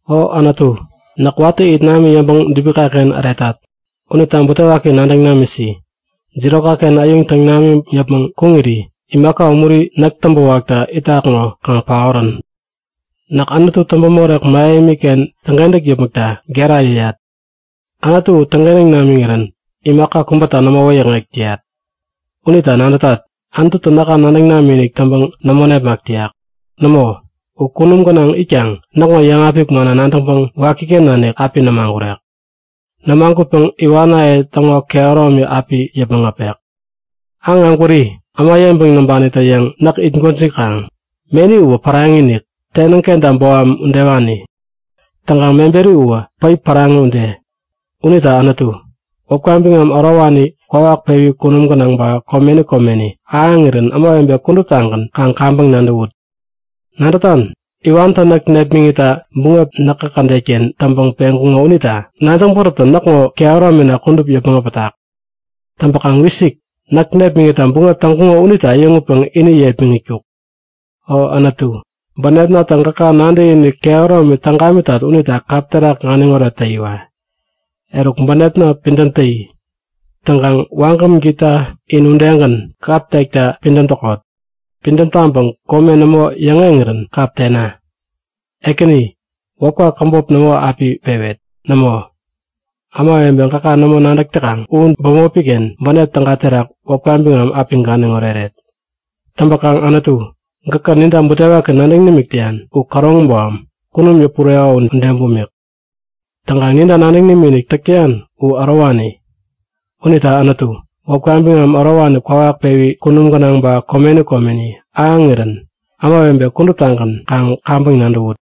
O Anutu, näk watä it nami yäŋpäŋ dubikaken äretat unita butewaki nadäŋ namisi. Jirokaken äyuŋ täŋ namiŋ yäpmäŋ kuŋiri imaka umuri näk täŋpäwakta itak ŋo kaŋ paorän! Näk Anutu täŋpämorek mähemiken täŋkentäk yäpmäkta gera yäyat. Anutu u täŋkentäŋ namiŋirän imaka kubäta nämo wäyäkŋek täyat. Unita nadätat; Anututä näka nadäŋ namikinik täŋpäŋ nämo nepmak täyak. Nämo! U kunum gänaŋ itkaŋ näkŋo yäŋapik manna nadäŋpäŋ wakiken nanik api nämagurek. Nämagutpäŋ iwanaye täŋo kehäromi api yäpmäŋ äpek. Aŋ ägwäri, äma yeŋpäŋ näŋpanitä-yäŋ näk it gwäjikaŋ. Meni uwä päraŋi-inik, tenäŋ kenta boham udewani. Täŋkaŋ meberi uwä päip päraŋi ude. Unita Anutu, wäpka biŋam ärowani kwawak pewi kunum gänaŋ ba komeni komeni ahäŋirän ämawebe kuduptagän kaŋ kaŋpäŋ nadäwut. Nadätan? Iwantä näk nepmäŋitta buŋep näkä kädetken täŋpäŋ peŋkuŋo unita nadäŋ bäräptä näkŋo kehäromina kudup yäpmäŋ äpätak. Täŋpäkaŋ wisik! Näk nepmäŋitta buŋep täŋkuŋo unitä äyäŋutpäŋ ini yepmäŋitkuk! O Anutu, bänepnatä gäka nadäkinik kehäromi täŋ gamitat unita kap terak ganiŋoret täyiwa! Eruk bänepna, pidäm täyi! Täŋkaŋ wagäm gita in udegän, kap tekta pidäm täkot! Pidäm taŋpäŋ kome nämo yäŋeŋirän kap tena! Ekäni, wäpka käbop nämo api pewet! Nämo, ämawebe gäka nämo nadäk täkaŋ u bämopiken bänep täga terak wäpka biŋam api ganiŋ oreret. Täŋpäkaŋ Anutu, gäkä ninta butewaki nadäŋ nimik täyan u käroŋi boham, kunum yäpureko ude bumik. Täŋkaŋ ninta nadäŋ nimikinik täk täyan u ärowani. Unita Anutu, wäpka biŋam ärowani kwawak pewi kunum gänaŋ ba komeni komeni ahäŋirän ämawebe kuduptagän kaŋ kaŋpäŋ nadäwut!